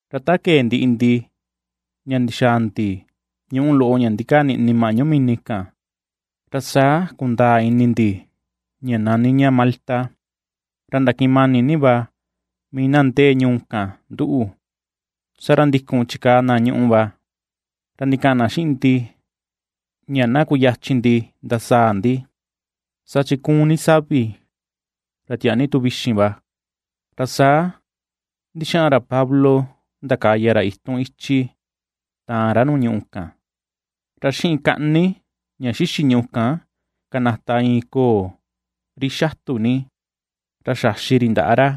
Ra ta kee ndiꞌi ndi, ña ndixaa ndi ñuꞌu loꞌo ña ndikaa niꞌni maꞌñu mini kan, ra saa kundaa ini ndi ña nani ña Malta. Ra ndakiꞌin mani ni va mii na ndee ñuu kan nduꞌu, ra saa ndikun chikaa na ñuꞌu va, ra ndikaꞌan na xiꞌin ndi ña na kuyachin ndi ndasaa ndi, saa chi ^kuun ni savi ra tiaa ni tu vixin va. Ra saa ndixaꞌan ra Pablo, ndakaya ra itun ichi taan ra nuu ñuꞌu kan, ra xiꞌin kaꞌni ña xixi ñuꞌu kan kanata iin koo ri xatu ni, ra xaxi ri ndaꞌa ra.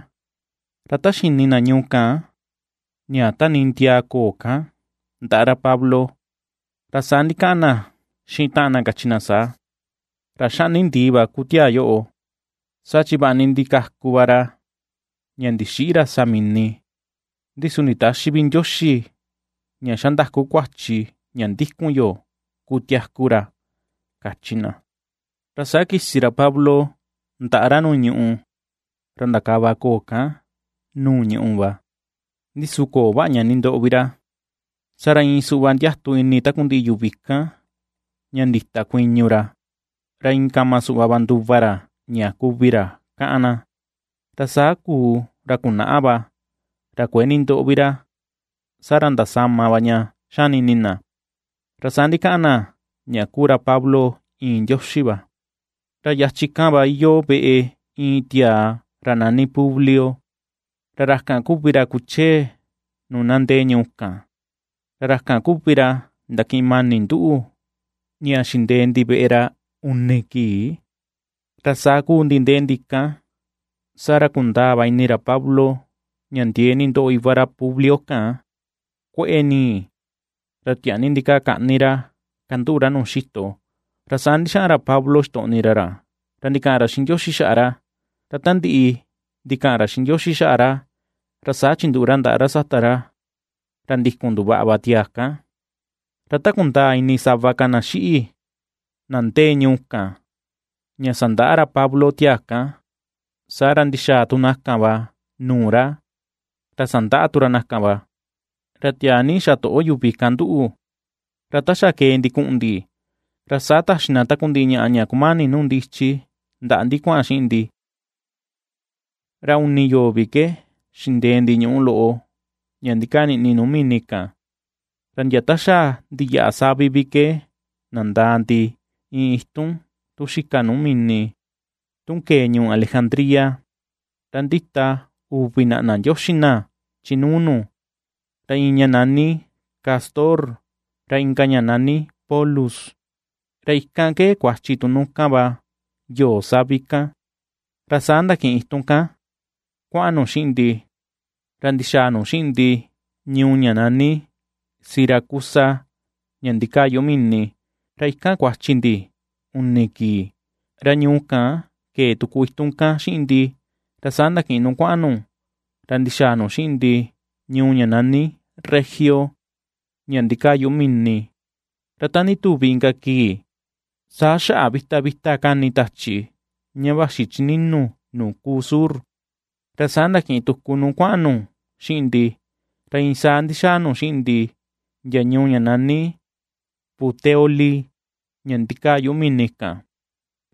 Ra ta xini na ñuu kan ña tanii ndiaa koo kan ndaꞌa ra Pablo, ra saa ndikaꞌan na xiꞌin taꞌan na kachi na saa: ―Ra ^xaꞌni ndii va kuu tiaa yoꞌo, saa chi vaꞌa ni ndikaku va ra ña ndixïꞌi ra sa mini, ndi su nditäxi vi ndioxi ña xa ndaku kuachi ña ndikun yo kutiaku ra ―kachi na. Ra saa kisi ra Pablo ndaꞌa ra nuu ñùꞌù, ra ndakava koo kan nuu ñùꞌù va, ndi su köo vaꞌa ña nindoꞌo vi ra. Ra iin suꞌva ndiatu ini takundiꞌi yuvi kan, ña ndita kuiñu ra, ra a iin kama suꞌva va nduva ra, ña kuvi ra káꞌán na. Ra saa kuu ra kunaꞌa va, ra kuëe nindoꞌo vi ra, saa ra ndasama va ña ^xani ini na, ra saa ndikaꞌan na ña kuu ra Pablo iin ndioxi va. Ra yachin kan va iyoo veꞌe iin tiaa ra nani Publio, ra ra kan kuvi ra kuchee nuu na ndee ñuu kan, ra ra kan kuvi ra ndakiꞌin mani nduꞌu ña xindee ndi veꞌe ra uni kii. Ra saa kuu ndi ndee ndi kan, saa ra kundaa va ini ra Pablo ña ndiee ni ndoꞌo iva ra Publio kan, kueꞌe nii, ra tiaa ni ndikaa kaꞌní ra kanduꞌu ra nuu xito. Ra saa ndixaꞌan ra Pablo xitoꞌni ra ra, ra ndikaꞌan ra xiꞌin Ndioxi xaꞌa ra, ra ta ndiꞌi ndikaꞌan ra xiꞌin Ndioxi xaꞌa ra, ra saa chinduꞌu ra ndaꞌa ra sata ra, ra ndikun nduvaꞌa va tiaa kan. Ra ta kundaa ini sava ka na xiꞌi, na ndee ñuu kan ña sandaꞌa ra Pablo tiaa kan, saa ra ndixaa tu na kan va nuu ra, ra sandaꞌa tu ra na kan. Ra tiaa ni xatoꞌo yuvi kan nduꞌu, ra ta xa kee ndi kuꞌun ndi, ra saa taxi na takundiꞌi ñaꞌa ña kumani nuu ndi ichi ndaꞌa ndi kuaꞌan xiꞌin ndi. Ra uni yoo vi ke xindee ndi ñuꞌu loꞌo, ña ndikaa niꞌni nuu mini kan, ra ndia ta xa ndiyaꞌa savi vi ke nandaa ndi, iin itun tun xika nuu mini tun kee ñuu Alejandría, ra ndita uvi naꞌna ndioxi na, chi nuu nu, ra iin ña nani Cástor, ra inka ña ñani Pólux, ra ikan ke kuachi tu nu kan va yoo savi kan. Ra saa ndakiꞌin itun kan kuaꞌan nu xiꞌin ndi, ra ndixaa nu xiꞌin ndi ñuu ña ñani Siracusa ña ndikaa yuꞌu mini, ra ikan kuachi ndi uni kii. Ra ñuu kan kee tuku itun kan xiꞌin ndi, ra saa ndakiꞌin nu kuaꞌan nu, ra ndixaa nu xiꞌin ndi ñuu ña ñani Regio ña ndikaa yuꞌu mini. Ra ta ndituvi inka kii, saa xaꞌa vita vita kani tachi ña vaxi chi ninu nuu kuu sur, ra saa ndakiꞌin tuku nu kuaꞌan nu xiꞌin ndi, ra iin saa ndixaa nu xiꞌin ndi ndia ñuu ña nani Puteoli ña ndikaa yuꞌu mini kan.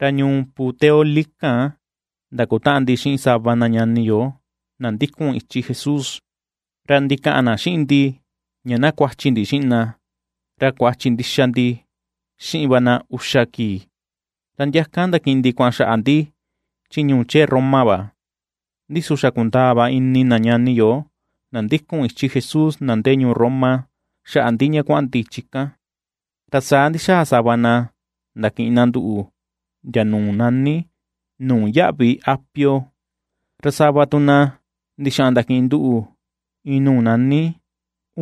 Ra ñuu Puteoli kan ndakutaꞌan ndi xiꞌin sava na ñani yo na ndikun ichi Jesús, ra ndikaꞌan na xiꞌin ndi ña na kuachi ndi xiꞌin na, ra kuachi ndixa ndi xiꞌin va na uxa kii, ra ndia kan ndakiꞌin ndi kuaꞌan xaꞌa ndi chi ñuu chee Roma va. Ndi su xa kundaa va ini na ñani yo, na ndikun ichi Jesús na ndee ñuu Roma, xaꞌa ndi ña kuaꞌan ndi chi kan, ra saa ndixaꞌan sava na ndakiꞌin na nduꞌu ndia nuu nani, Nuu yaꞌvi Apio, ra sava tu na ndixaꞌan ndakiꞌin nduꞌu iin nuu nani,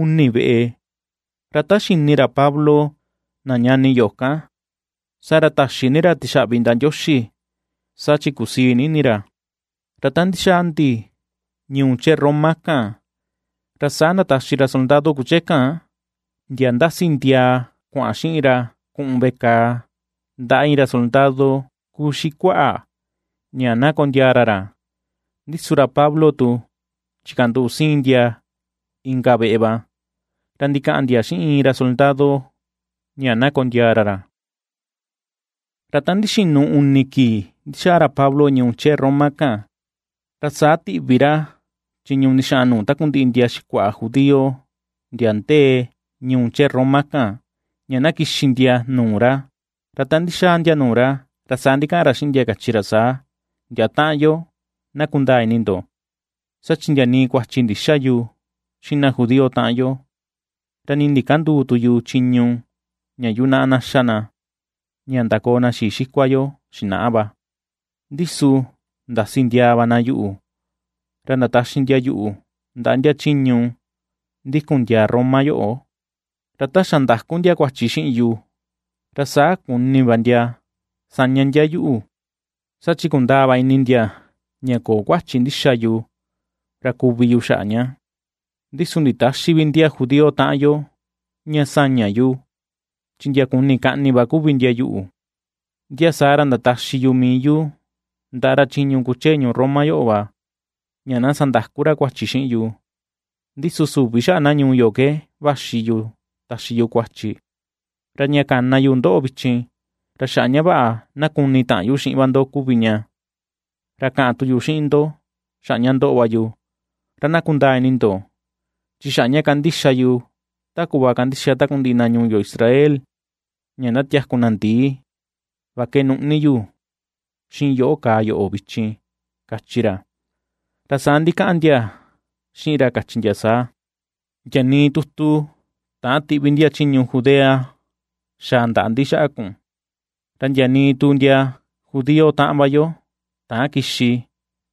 Uni Veꞌe. Ra ta xini ra Pablo na ñani yo kan, saa ra taxi ni ra tixaꞌvi ndaꞌa Ndioxi, saa chi kusii ni ini ra. Ra ta ndixaa ndi ñuu chee Roma kan, ra saa ndataxi ra soldado kuchee kan, ndia ndasi ndiaa kuaꞌan xiꞌin ra kuꞌun veꞌe kàà ndaꞌa iin ra soldado kuxikuaꞌa, ña na kondiaa ra ndia, ndi su ra Pablo tu chikanduꞌu siin ndia inka veꞌe va, ra ndikaꞌan ndia xiꞌin iin ra soldado ña na kondiaa ra ra. Ra ta ndixinu uni kii ndixaa ra Pablo ñuu chee Roma kan, ra saa tiꞌvi ra chiñu ndixaꞌan nuu takundiꞌi ndia xikuaꞌa judío ndia ndee ñuu chee Roma kan ña na kixi ndia nuu ra, ra ta ndixaa ndia nuu ra, ra saa ndikaꞌan ra xiꞌin ndia, kachi ra saa: ―Ndia taꞌan yo, na kundaa ini ndo, saa chi ndia nii kuachi ndïxa yu xiꞌin na judío taꞌan yo, ra nii ndikänduu tu yu chiñu ña yunaꞌa na xa na, ña ndakoo na xii xikua yo xinaꞌa va, ndi su ndasi ndiaa va na yuꞌu, ra ndataxi na yuꞌu ndaꞌa ndia chiñu ndikun ndia Roma yoꞌo va. Ra ta xa ndaku ndia kuachi xiꞌin yu, saa ra kuni va ndia saña ndia yuꞌu va, saa chi kundaa va ini ndia, ña köo kuachi ndixa yu ra kuvi yu xaꞌa ña. Ndi su nditäxi vi ndia judío taꞌan yo ña saña yu, chi ndia kuni kaꞌni va kuvi ndia yuꞌu, ndia saa ra ndataxi yu mii yu ndaꞌa ra chiñu kuchee ñuu Roma yoꞌo va, ña na sandaku ra kuachi xiꞌin yu, ndi su süvi xaꞌa na ñuu yo ke vaxi yu taxi yu kuachi. Ra ña kana yu ndoꞌo vichin, ra xaꞌa ña vaꞌa na kuni taꞌan yu xiꞌin va ndo kuvi ña, ra kaꞌan tu yu xiꞌin ndo xaꞌa ña ndoꞌo va yu, ra na kundaa ini ndo, chi xaꞌa ña kandixa yu ta kuꞌva kandixa takundiꞌi na ñuu yo Israel ña ndatiaku na ndii, va ke nuꞌni yu, xiꞌin yoꞌó kaa yoꞌo vichin ―kachi ra. Ra saa ndikaꞌan ndia xiꞌin ra kachi ndia saa: ―Ndia nii tutu täan tiꞌvi ndia chiñu Judea xaa ndaꞌa ndi xaꞌa kun, ra ndia nii tu ndia judío taꞌan va yo, täan kixi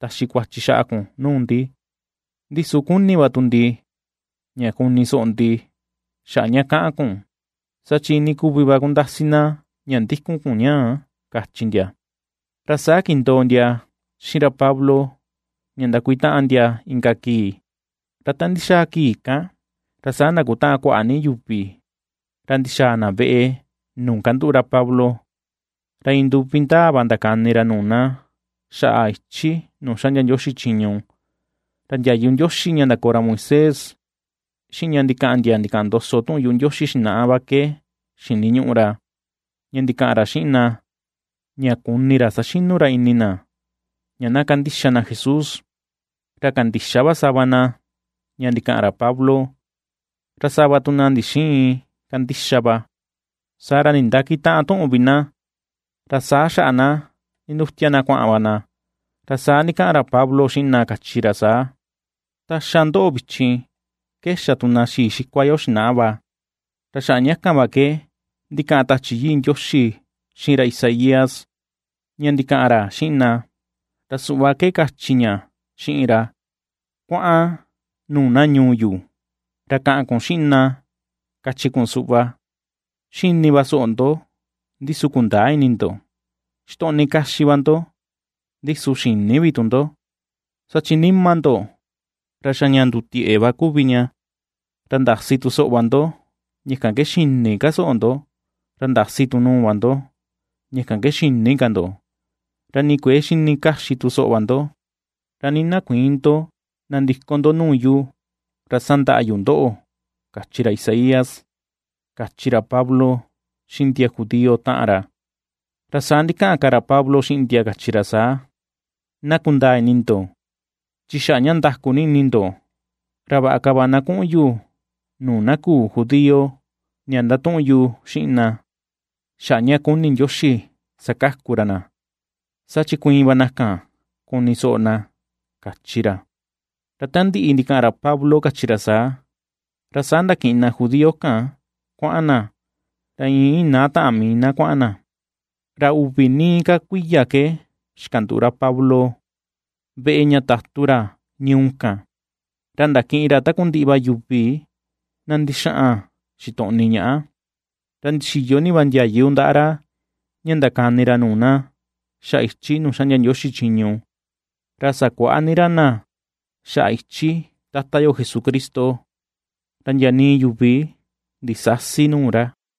taxi kuachi xaꞌa kun nuu ndi. Ndi su ^kuni va tu ndi ña kuni soꞌo ndi, xaꞌa ña kaꞌan kun, saa chi iinii kuvi va kundasi na ña ndikun kun ñaa ―kachi ndia. Ra saa kindoo ndia xiꞌin ra Pablo ña ndakuitaꞌan ndia inka kii. Ra ta ndixaa kii kan, ra saa ndakutaꞌan kuaꞌa ni yuvi ra ndixaa na veꞌe nuu kanduꞌu ra Pablo. Ra iin nduvi ndaa va ndakani ra nuu na, xaꞌa ichi nuu xaꞌndia Ndioxi chiñu. Ra ndiayu Ndioxi ña ndakoo ra Moisés, xiꞌin ña ndikaꞌan ndia ndikaꞌan ndoso tuꞌun yuꞌu Ndioxi xinaꞌa va ke xiniñuꞌu ra, ña ndikaꞌan ra xiꞌin na ña kuni ra ^saxinu ra ini na, ña na ^kandixa na Jesús. Ra kandixa va sava na ña ndikaꞌan ra Pablo, ra sava tu na ndixïin kandixa va. Saa ra nindakitäꞌan tuꞌun vi na, ra saa xaꞌa na nindutia na kuaꞌan va na. Ra saa ndikaꞌan ra Pablo xiꞌin na, kachi ra saa: ―Ta xa ndoꞌo vichin, ke ^xa tu na xii xikua yo xinaꞌa va, ra xaꞌa kan va ke ndikaꞌan tachi Yii Ndioxi xiꞌin ra Isaías, ña ndikaꞌan ra xiꞌin na, ra suꞌva ke kachi ña xiꞌin ra: Kuaꞌan nuu na ñuu yu, ra kaꞌan kun xiꞌin na kachi kun suꞌva: xini va soꞌo ndo, ndi su kundäa ini ndo; xitoꞌni kaxi va ndo, ndi su xïni vi tu ndo, Saa chi nima ndo, ra xa ña ndutieꞌe va kuvi ña, ra ndasi tu soꞌo va ndo, ña kan ke xïni ka soꞌo ndo, ra ndasi tu nuu va ndo; ña kan ke xïni kan ndo, Ra nii kuëe xini kaxi tu soꞌo va ndo, Ra ni na kuïin ndo nandiko ndo nuu yu, ra sandaꞌa yu ndoꞌo, kachi ra Isaías ―kachi ra Pablo xiꞌin ndia judío taꞌan ra. Ra saa ndikaꞌan ka ra Pablo xiꞌin ndia, kachi ra saa: ―Na kundaa ini ndo, chi xaꞌa ña ndaku ni ini ndo, ra vaꞌa ka va na kuꞌun yu nuu na küu judío ña ndatuꞌun yu xiꞌin na, xaꞌa ña kuni Ndioxi sakaku ra na, saa chi kuiin va na kan kuni soꞌo na ―kachi ra. Ra ta ndiꞌi ndikaꞌan ra Pablo kachi ra saa, ra saa ndakiꞌin na judío kan kuaꞌan na, ra iin inaa taꞌan mii na kuaꞌan na. Ra uvi nii ka kuiya ke xikanduꞌu ra Pablo veꞌe ña tatu ra ñuu kan, ra ndakiꞌin ra takundiꞌi va yuvi na ndixaꞌan xitoꞌni ñaꞌa. Ra ndixiyo ni va ndiayu ndaꞌa ra, ña ndakani ra nuu na xaꞌa ichi nuu xaꞌndia Ndioxi chiñu, ra sakuaꞌa ni ra na xaꞌa ichi Tata yo Jesucristo, ra ndia nii yuvi ndisäsi nuu ra.